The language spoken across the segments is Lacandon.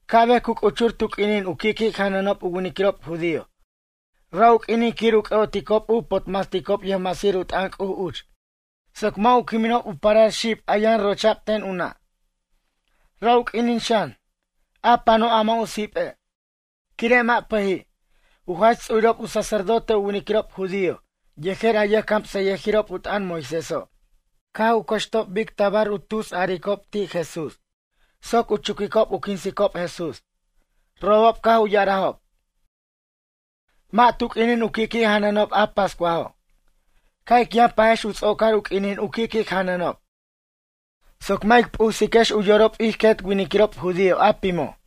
Ca'bej cu c'uchur tu q'uinin u qui' qui' janʌnob u winiquirob judío. Ra' u q'uinin quir u c'ʌ'oticob u potmasticob yʌjmasir u t'ʌn C'uj uch, soc mʌ' u quiminob u parar xib a yʌn rocha'b ten u nʌ'. Ra' u q'uinin xan, a pano' a mʌ' u sipe', quire' mʌ' pʌji'. U jach ts'urirob u sacerdote u winiquirob judío yejer a yʌjcamsʌyʌjirob u t'ʌn Moiséso' caj u cʌxtob bic tabar u tusaricob ti' Jesús soc u chuquicob u quinsicob Jesús. Robob caj u ya'arajob: ―Mʌ' tu q'uinin u qui' qui' janʌnob a pascuajo'. Ca' ic yʌn pajex u ts'ocar u quinin u qui' qui' janʌnob, soc mʌ' ic p'usiquex u yorob ij quet winiquirob judío a pimo'.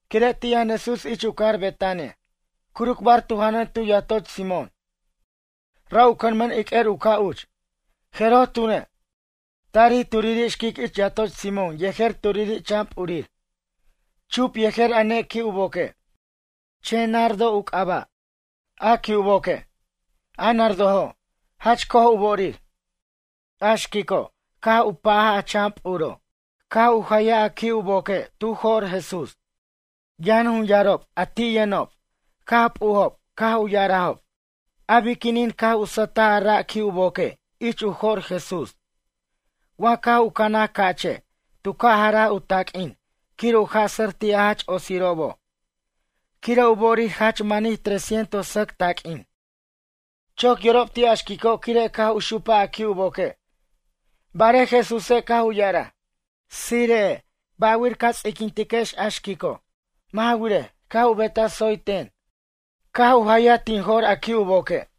Quire' ti' yʌn Jesús ich u cajar Betania, curucbar tu janʌn tu yatoch Simón. Ra' u cʌnmʌn iq'uer u ca' uch. Jeroj tune', tarij turiri' xquic ich yatoch Simón yejer turiri' chan p'urir, chup yejer a ne qui' u boque', chen nardo u c'aba', a qui' u boque'. A nardojo', jach co'oj u bo'orir. A xquico' caj u pa'aj a chan p'uro' caj u wecaj a qui' u boque' tu jo'r Jesús. Yan jun yarob a ti' yʌnob, caj p'ujob, caj u ya'arajob: ―A biquinin caj u sʌtaj a ra' qui' u boque' ich u jo'r Jesús? Wa caj u canaj ca'che' tu ca' jaraj u taq'uin quir u jasʌr ti' a jach otsirobo'. Quire' u bo'orir jach manij tres cientos sʌc taq'uinob. Choc yorob ti' a xquico' quire' caj u xupaj a qui' u boque'. Barej Jesúse' caj u ya'araj: ―Tsire'ej, ba'wir ca ts'iquintex a xquico'. Mʌ' ja wirej, caj u betaj tsoy ten, caj u jayaj tin jo'r a qui' u boque'.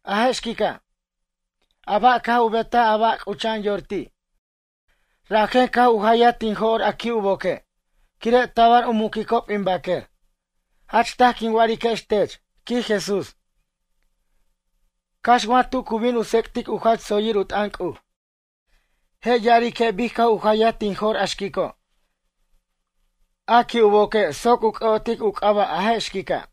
A je' xquica', a ba' caj u betaj a ba' c'ucha'an yor ti', rajen caj u jayaj tin jo'r a qui' u boque', quire' tabar u muquicob in baquer. Jach taj quin wa'ariquex tech ―quij Jesús―. Cax wa tu cu bin u tsec'tic u jach tsoyir u t'ʌn C'uj, je' ya'arique' bic caj u jayaj tin jo'r a xquico', a qui' u boque' soc u c'ʌ'otic u c'aba' a je' xquica'.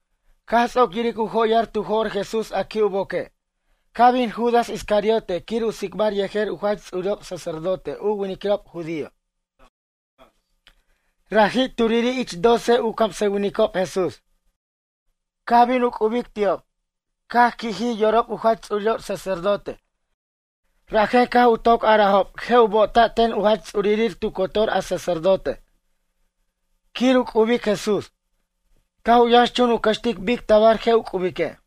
Caj ts'oc yiric u joyar tu jo'r Jesús a qui' u boque', caj bin Judas Iscariote quir u tsicbar yejer u jach ts'urirob sacerdote u winiquirob judío. Raji' turiri' ich doce u camsʌwinicob Jesús. Caj bin u c'ubic ti'ob. Caj qui'jij yorob u jach ts'urirob sacerdote rajen caj u toc arajob je' u bo'ota' ten u jach ts'urir tu cotor u sacerdote quir u c'ubic Jesús. Caj u yʌnxchun u cʌxtic bic tabar je' u c'ubique'.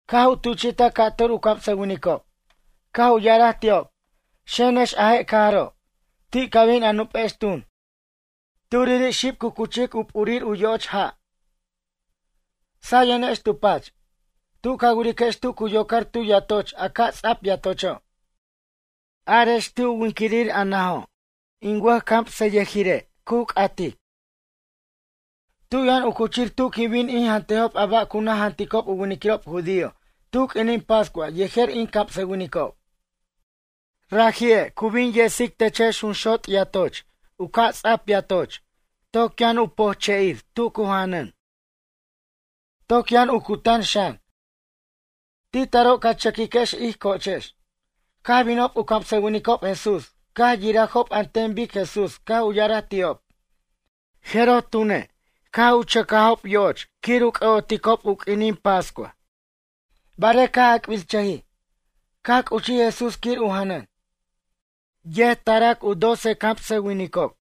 Caj u tuchi'taj ca'tur u camsʌwinicob, caj u ya'araj ti'ob: ―Xenex a je' cajaro', ti' ca bin a nupex tun, turiri' xib cu cuchic u p'urir u yo'och ja', sayenex tu pach. Tu ca wiriquex tu cu yocar tu yatoch a ca' ts'ap yatocho', arex ti' u yumin a najo': “Yʌjcamsʌyʌnireche' cu c'atic: Tu yʌn u cuchir tu quin bin in jantejob a ba' cu naj janticob u winiquirob judío tu q'uinin pascua yejer in camsʌwinicob?” Raji'e' cu bin yesic techex junxot' yatoch u ca' tsap yatocho' toc yʌn u pojche'ir tu cu janʌn. Toc yʌn u cutan xan. Ti' taro' ca chʌquiquex ij co'ochex. Caj binob u camsʌwinicob Jesús caj yirajob an ten bic Jesús caj u ya'araj ti'ob, jeroj tune', caj chʌcajob yo'och quir u c'ʌ'oticob u q'uinin pascua. Barej caj ac'birchʌjij, caj c'uchij Jesús quir u janʌn. Yet tarac u doce u camsʌwinicob.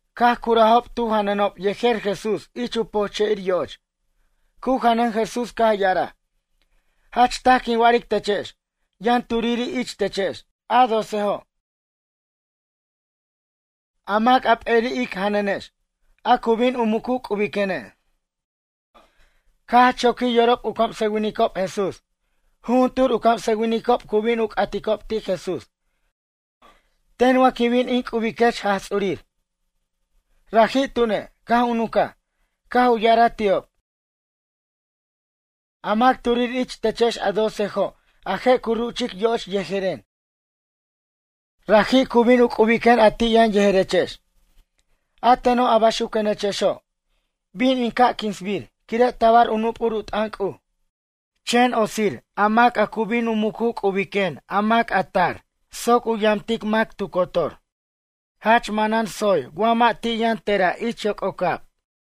Caj curajob tu janʌnob yejer Jesús ich u pojche'ir yo'och. Cu janʌn Jesús caj ya'araj: ―Jach taj quin wa'aric techex. Yʌn turiri' ich techex, a docejo', a mac a p'eri' ic janʌnex, a cu bin u mucu c'ubiquene'. Caj jach choquij yorob u camsʌwinicob Jesús. Jujuntur u camsʌwinicob cu bin u c'aticob ti' Jesús: ―Ten wa quin bin in c'ubiquech Jaj Ts'urir? Raji' tune', caj u nuncaj, caj u ya'araj ti'ob: ―A mac turiri' ich techex a docejo' a je' cu ruchic yo'och yejeren, raji' cu bin u c'ubiquen a ti' yʌn yejerechex. A teno' a baxuquenechexo', bin in ca' quinsbir, quire' tabar u nup'ur u t'ʌn C'uj. Chen otsir a mac a cu bin u mucu c'ubiquen a mac a tar soc u yamtic mac tu cotor. Jach manan tsoyir wa mʌ' ti' yʌn tera' ich yoc'ocab.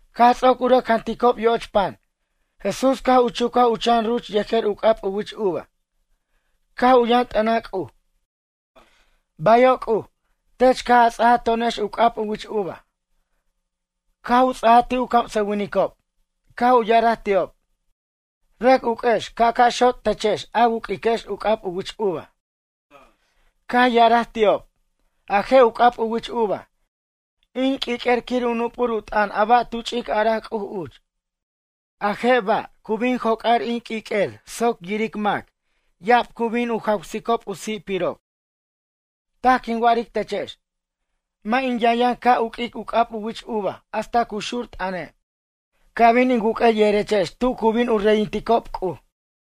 Caj ts'oc u rʌc janticob yo'och pan, Jesús caj u chucaj u chan ruch yejer u c'ab u wich uva. Caj u yʌn t'ʌnaj C'uj: ―Bayo' C'uj, tech caj a ts'aja to'onex u c'ab u wich uva. Caj u ts'aja ti' u camsʌwinicob, caj u ya'araj ti'ob: ―Rʌc uq'uex ca' ca' xot' techex a wu'q'uiquex u c'ab u wich uva. Caj ya'araj ti'ob: ―A je' u c'ab u wich uva, in q'uiq'uer quir u nup'ur u t'ʌn a ba' tu ch'ic araj C'uj uch. A je' ba' cu bin joc'ar in q'uiq'uer soc yiric mac, ya'ab cu bin u jawsicob u si'pirob. Taj quin wa'aric techex. Mʌ' in yʌnyʌn ca' uq'uic u c'ab u wich uva hasta cu xur t'ʌne', ca' bin in wuq'uej yejerex tu cu bin u reyinticob C'uj.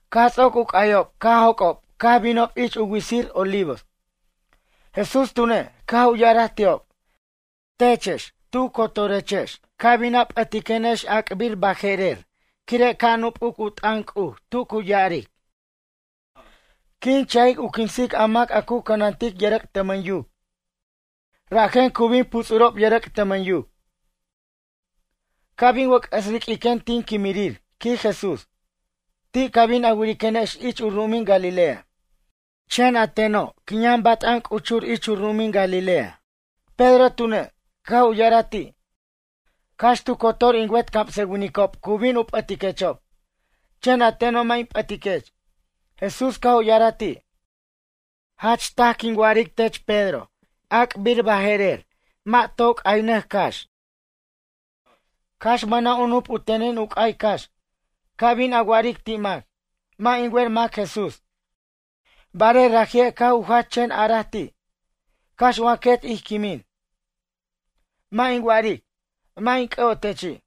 Caj ts'oc u c'ayob caj joc'ob caj binob ich u witsir Olivos. Jesús tune', caj u ya'araj ti'ob: ―Techex tu cotorechex ca bin a p'ʌtiquenex ac'bir baje'rer quire' ca' nup'uc u t'ʌn C'uj tu cu ya'aric: “Quin cha'ic u quinsic a mac a cu cʌnantic yʌrʌc' tʌmʌn yuc, rajen cu bin puts'urob yʌrʌc' tʌmʌn yuc.” Ca' bin wʌc'ʌs riq'uiquen tin quimirir ―quij Jesús―, ti' ca bin a wiriquenex ich u ru'umin Galilea. Chen a teno' quin yʌn bat'an c'uchur ich u ru'umin Galilea. Pedro tune', caj u ya'araj ti': ―Cax tu cotor in wet camsʌwinicob cu bin u p'ʌtiquechob, chen a teno' mʌ' in p'ʌtiquech. Jesús caj u ya'araj ti': ―Jach taj, quin wa'aric tech, Pedro. Mʌ' toy c'aynʌc cax ac'bir baje'rer, cax mʌna' u nup u tenin u c'ay cax, ca bin a wa'aric ti' mac: “Mʌ' in wer mac Jesús.” Barej raji'e' caj u jach chen a'araj ti': ―Cax wa quet ij quimin, mʌ' in wa'aric: “Mʌ' in c'ʌ'otechi'.”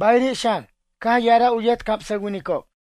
Bayiri' xan, caj ya'araj u yet camsʌwinicob.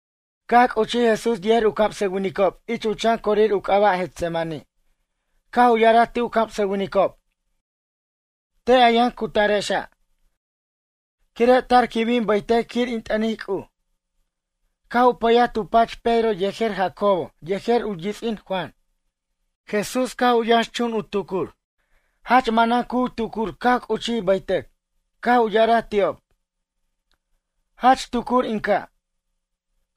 Caj c'uchij Jesús yejer u camsʌwinicob ich u chan corir u c'aba' Getsemaní. Caj u ya'araj ti' u camsʌwinicob: ―Te' a yʌn cutarexa', quire' tar quin bin baytʌc quir in t'ʌnic C'uj. Caj u pʌyaj tu pach Pedro yejer Jacobo yejer u yits'in Juan. Jesús caj u yʌnxchun u tucur, jach manan cu tucur caj c'uchij baytʌc. Caj u ya'araj ti'ob: ―Jach tucur in caj.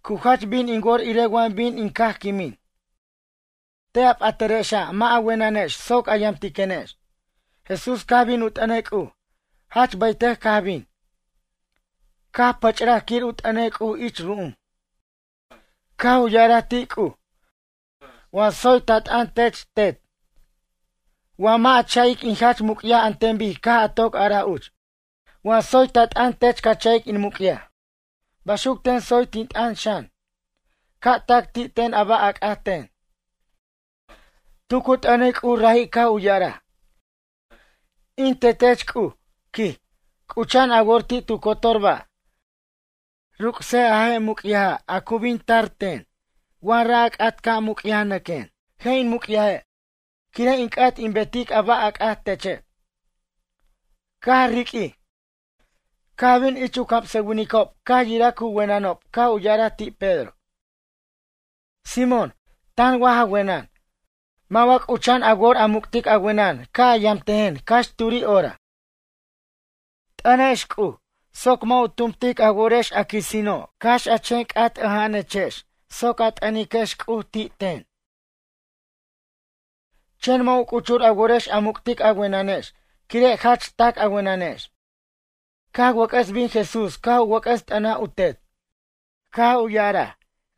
Cu jach bin in wor irej wa bin in caj quimin. Te' a p'atarexa' mʌ' a wenʌnex soc a yamtiquenex. Jesús caj bin u t'ʌnej C'uj. Jach baytʌc caj bin, caj pʌch'raj quir u t'ʌnej C'uj ich ru'um. Caj u ya'araj ti' C'uj: ―Wa tsoy ta t'ʌn tech Tet, wa mʌ' a cha'ic in jach muc'yaj an ten bic caj a toc araj uch. Wa tsoy ta t'ʌn tech ca cha'ic in muc'yaj, baxuc ten tsoy tin t'ʌn xan, ca' tac ti' ten a ba' a c'at ten. Tu cu t'ʌnic C'uj raji' caj u ya'araj: ―In Tetech C'uj ―quij―, c'ucha'an a wor ti' tu cotor ba', ruc'sej a je' muc'yaja' a cu bin tar ten wa ra' a c'at ca' muc'yajnʌquen, je' in muc'yaje', quire' in c'at in betic a ba' a c'at teche'. Caj riq'uij, caj bin ich u camsʌwinicob caj yiraj cu wenʌnob caj u ya'araj ti' Pedro: ―Simón, tan wa ja wenʌn? Mʌ' wa c'ucha'an a wor a muc'tic a wenʌn ca' a yamtejen cax turi' hora? T'ʌnex C'uj, soc mʌ' u tumtic a worex, a quisino'. Cax a chen c'at ʌja'anechex soc a t'ʌniquex C'uj ti' ten. Chen mʌ' u c'uchur a worex a muc'tic a wenʌnex quire' jach tac a wenʌnex. Caj wʌc'ʌs bin Jesús caj u wʌc'ʌs t'ʌnaj u Tet, caj u ya'araj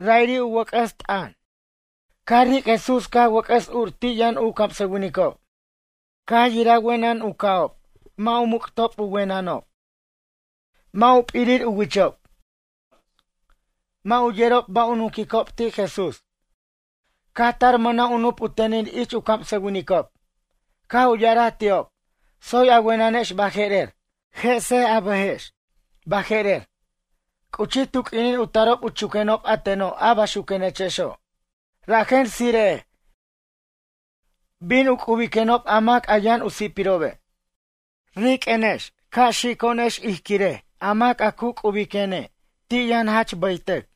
ra'iri' u caj wʌc'ʌs t'ʌno'. Caj ric' Jesús caj wʌc'ʌs ur ti' yʌn u camsʌwinicob. Caj yiraj wenʌn u ca'ob, mʌ' u muc'tob u wenʌnob. Mʌ' u p'irir u wichob. Mʌ' u yerob ba' u nunquicob ti' Jesús. Caj tar mʌna' u nup u tenin ich u camsʌwinicob, caj u ya'araj ti'ob: ―Tsoy a wenʌnex baje'rer, jesej a bʌjex, baje'rer, c'uchij tu q'uinin u tarob u chuquenob a teno' a baxuquenechexo', rajen tsire'ej. Bin u c'ubiquenob a mac a yʌn u si'pirobe'. Riq'uenex, ca' xico'onex iric a mac a c'ubiquene' ti' yʌn jach baytʌc.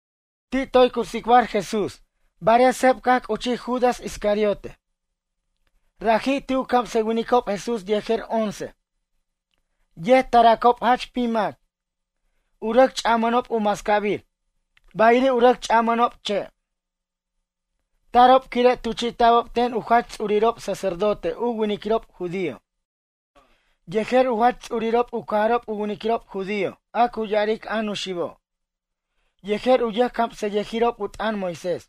Ti' toy cu tsicbar Jesús barej seb caj c'uchij Judas Iscariote, raji' ti' u camsʌwinicob Jesús yejer once. Yet taracob jach pim mac, u rʌc ch'amʌnob u mascabir, bayiri' u rʌc ch'amʌnob che'. Tarob quire' tuchi'ta'bob ten u jach ts'urirob sacerdote u winiquirob judío, yejer u jach ts'urirob u cajarob u winiquirob judío, a cu ya'aric a Nuxibo', yejer u yʌjcamsʌyʌjiriob u t'ʌn Moisés.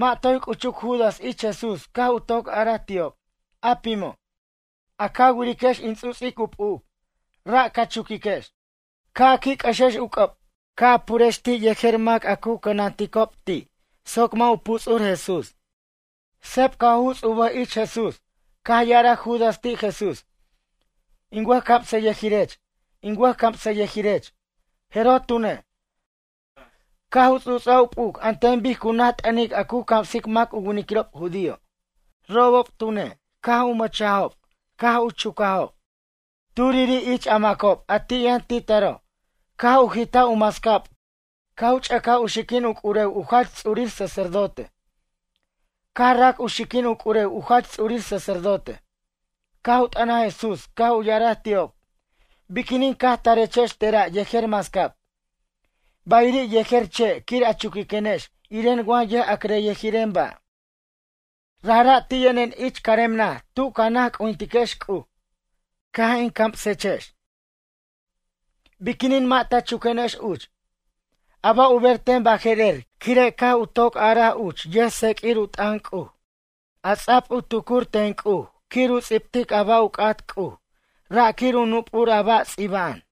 Mʌ' toy c'uchuc Judas ich Jesús caj u toc araj ti'ob, a pimo': ―A ca wiriquex in ts'uts'ic u p'uc, ra' ca chuquiquex, ca' a qui' c'ʌxex u c'ʌb, ca' a purex ti' yejer mac a cu cʌnanticob ti' soc mʌ' u puts'ur Jesús. Seb caj u juts' u bʌj ich Jesús, caj ya'araj Judas ti' Jesús: ―In wʌjcamsʌyʌjirech, in wʌjcamsʌyʌjirech. Jeroj tune', caj u ts'uts'aj u p'uc an ten bic cu naj t'ʌnic a cu camsic mac u winiquirob judío. Robob tune', caj u mʌchajob, caj u chucajob. Turiri' ich a macob a ti' yʌn ti' taro', caj u jitaj u mascab caj u ch'ʌcaj u xiquin u c'urew u jach ts'urir sacerdote, caj rac u xiquin u c'urew u jach ts'urir sacerdote. Caj u t'ʌnaj Jesús caj u ya'araj ti'ob: ―Biquinin caj tarechex tera' yejer mascab, bayiri' yejer che' quir a chuquiquenex iren wa yʌja'criryʌjiren ba'. Rajra' ti' yʌnen ich carem naj tu ca naj c'ujintiquex C'uj, caj in camsechex. Biquinin mʌ' ta chuquenex uch? A ba' u ber ten baje'rer quire' caj u toc araj uch yʌjtseq'uir u t'ʌn C'uj, a ts'a'b u tucuric ten C'uj quir u ts'ibtic a ba' u c'at C'uj, ra' quire' u nup'ur a ba' ts'iba'an.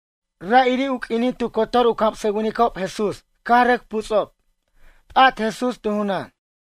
Ra'iri' u q'uinin tu cotor u camsʌwinicob Jesús caj rʌc puts'ob. P'at Jesús tu junan.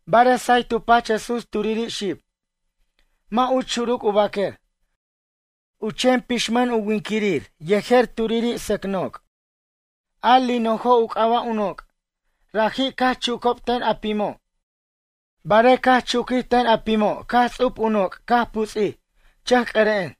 Barej say tu pach Jesús turiri' xib, mʌ' uch xuruc u baquer, u chen buquinmʌn u winquirir yejer turiri' sʌc noc', a linojo' u c'aba' u noc'. Raji' caj chucob ten a pimo'. Barej caj chuquij ten a pimo' caj ts'ub u noc' caj puts'ij, chʌc'ʌren.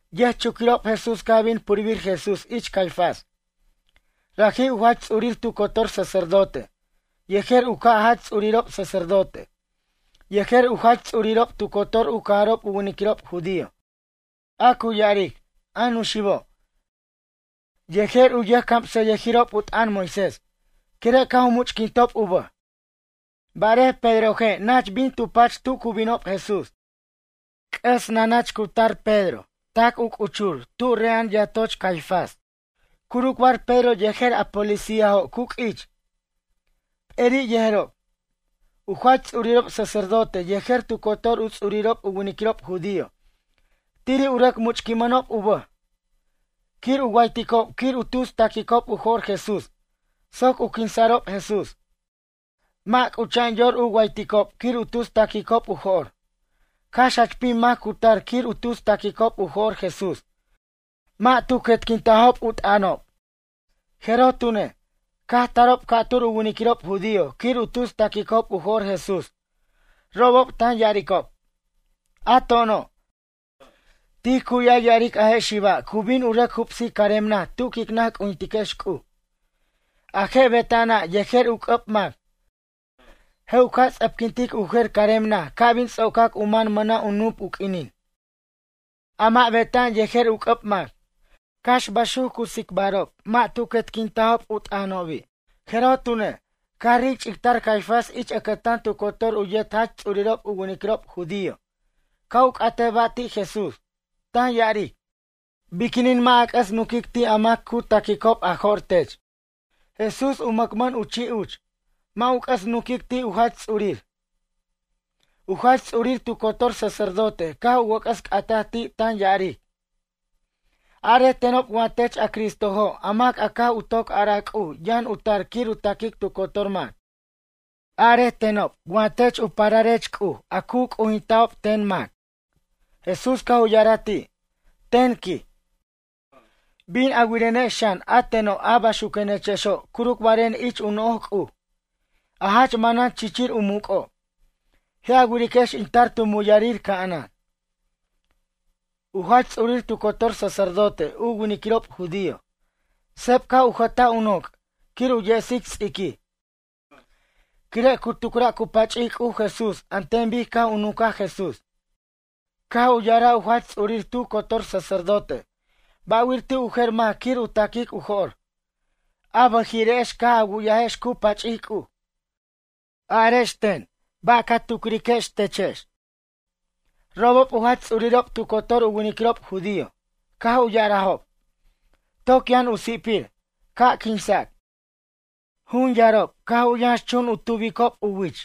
Yʌjchuquirob Jesús caj bin purbir Jesús ich Caifás. Raji' u jach ts'urir tu cotor sacerdote, yejer u jer u ca' jach ts'urirob sacerdote, yejer u jach ts'urirob tu cotor u cajarob u winiquirob judío, a cu ya'aric, a Nuxibo', yejer u yʌjcamsʌyʌjirib u t'ʌn Moisés, quire' caj u much'quintob u bʌj. Barej Pedroje' nach bin tu pach tu cu binob Jesús. C'ʌs nanach cu tar Pedro tac c'uchur tub re'a'an yatoch Caifás. Curucbar Pedro yejer a policíajo' cu q'uich, p'eri' yejerob. U jach ts'urirob sacerdote yejer tu cotor u ts'urirob u winiquirob judío, tiri' u rʌc much'quinmʌnob u bʌj quir u wayticob quir u tus taquicob u jo'r Jesús soc u quinsa'rob Jesús. Mʌ' c'ucha'an yor u wayticob quir u tus taquicob u jo'r. Cax jach pim mac cu tar quir u tus taquicob u jo'r Jesús, mʌ' tu quetquintajob u t'ʌnob. Jeroj tune', caj tarob ca'tur u winiquirob judío quir u tus taquicob u jo'r Jesús, robob tan ya'aricob: ―A to'ono', tij cu'yaj ya'aric a je' xiba' cu bin u rʌc jubsic carem naj tu quic naj c'ujintiquex C'uj. A je' beta'ana' yejer u c'ʌb mac, je' u ca' ts'ʌpquintic u jer carem naj ca' bin ts'ocac u man mʌna' u nup u q'uinin, a mʌ' beta'an yejer u c'ʌb mac. Cax baxuc cu tsicbarob mʌ' tu quetquintajob u t'ʌnobi'. Jeroj tune', caj ric ch'ictar Caifás ich ʌcʌtan tu cotor u yet jach ts'urirob u winiquirob judío ca' u c'atej ba' ti' Jesús, tan ya'aric: ―Biquinin mʌ' a c'ʌs nunquic ti' a mac cu taquicob a jo'r tech? Jesús u mʌcmʌn u chi' uch, mʌ' u c'ʌs nunquic ti' u jach ts'urir. U jach ts'urir tu cotor sacerdote caj u wʌc'ʌs c'atej ti' tan ya'aric: ―Arej tenob wa tech a Cristojo' a mac caj u toc araj C'uj yʌn u tar quir u taquic tu cotor mac? Arej tenob wa tech u pararech C'uj a cu c'ujinta'bo' ten mac? Jesús caj u ya'araj ti': ―Ten ―quij―, bin a wirenex xan a teno' a baxuquenechexo' curucbaren ich u no'oj C'uj, a jach manan chichir u muc'o'. Je' a wiriquex in tar tu muyʌrir ca'anan. U jach ts'urir tu cotor sacerdote u winiquirob judío, seb caj u jʌtaj u noc' quir u yesic ts'iquij, quire' cu tucra' cu pach'ic C'uj Jesús an ten bic caj u nuncaj Jesús, caj u ya'araj u jach ts'urir tu cotor sacerdote: ―Ba'wir ti' u jer mac quir u ta'quic u jo'r? A bʌjiri'ex caj a wu'yajex cu pach'ic C'uj. Arex ten ba' ca tucriquex te'ex? Robob u jach ts'urirob tu cotor u winiquirob judío, caj u ya'arajob: ―Toc yʌn u si'pir, ca' quinsac. Jun yarob caj u yʌnx chun u tubob u wich,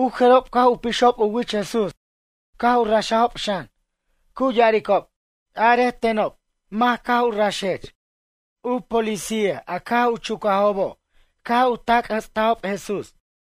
u jerob caj u pixob u wich Jesús caj u raxajob xan, cu ya'aricob: ―Arej tenob mac caj u raxech. U policía a caj u chucajobo' caj u tacjʌts'ajob Jesús.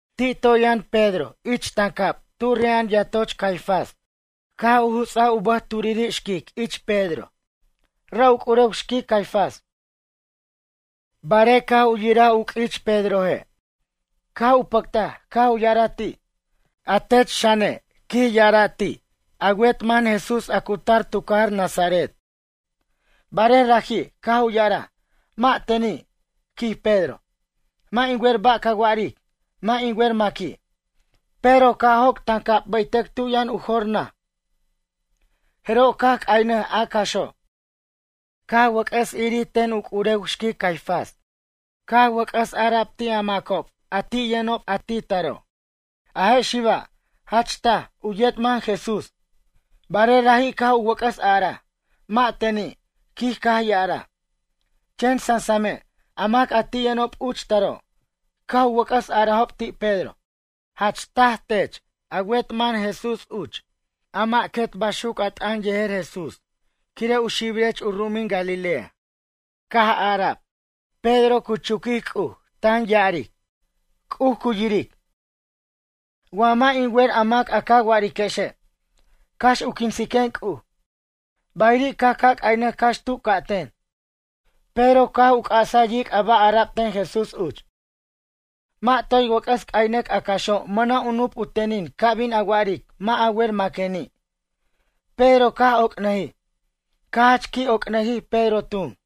Ti' toy yʌn Pedro ich tancab tu re'a'an yatoch Caifás, caj u juts'aj u bʌj turiri' xquic ich Pedro. Ra' u c'urew xquic Caifás; Barej caj u yiraj cu q'uich Pedroje', caj u pʌctaj, caj u ya'araj ti': ―A tech xane' ―quij ya'ara'―, ti' a wet man Jesús a cu tar tu cajar Nazaret. Barej raji', caj u ya'araj: ―Mʌ' teni' ―quij Pedro―. Mʌ' in wer ba' ca wa'aric. Mʌ' in wer maqui'. Pedro caj joc' tancab baytʌc tu yʌn u jor naj, jeroj caj c'aynʌj a caxo'. Caj wʌc'ʌs irir ten u c'urew xquic Caifás caj wʌc'ʌs a'ara ti' a macob a ti' yʌnob taro': ―A je' xiba', jach taj, u yet man Jesús. Barej raji' caj u wʌc'ʌs a'araj: ―Mʌ' teni' ―quij caj ya'araj. Chen sansame', a mac a ti' yʌnob uch taro', caj u wʌc'ʌs a'arajob ti' Pedro: ―Jach taje' tech a wet mʌn Jesús uch, a mʌ' quet baxuc a t'ʌn yejer Jesús quire' u xibirech u ru'umin Galilea. Caj ara'b Pedro, cu chuquic C'uj, tan ya'aric: ―C'uj cu yiric, wa mʌ' in wer a mac a ca wa'ariquexe', cax u quinsiquen C'uj. Bayiri' caj ca' c'aynʌj cax tu ca' ten, Pedro caj u c'asaj yic' a ba' ara'b ten Jesús uch: “Mʌ' toy wʌc'ʌs c'aynʌc a caxo' mʌna' u nup u tenin ca bin a wa'aric mʌ' a wer maqueni'.” Pedro caj oc'nʌjij. Caj jach qui' oc'nʌjij Pedro tun.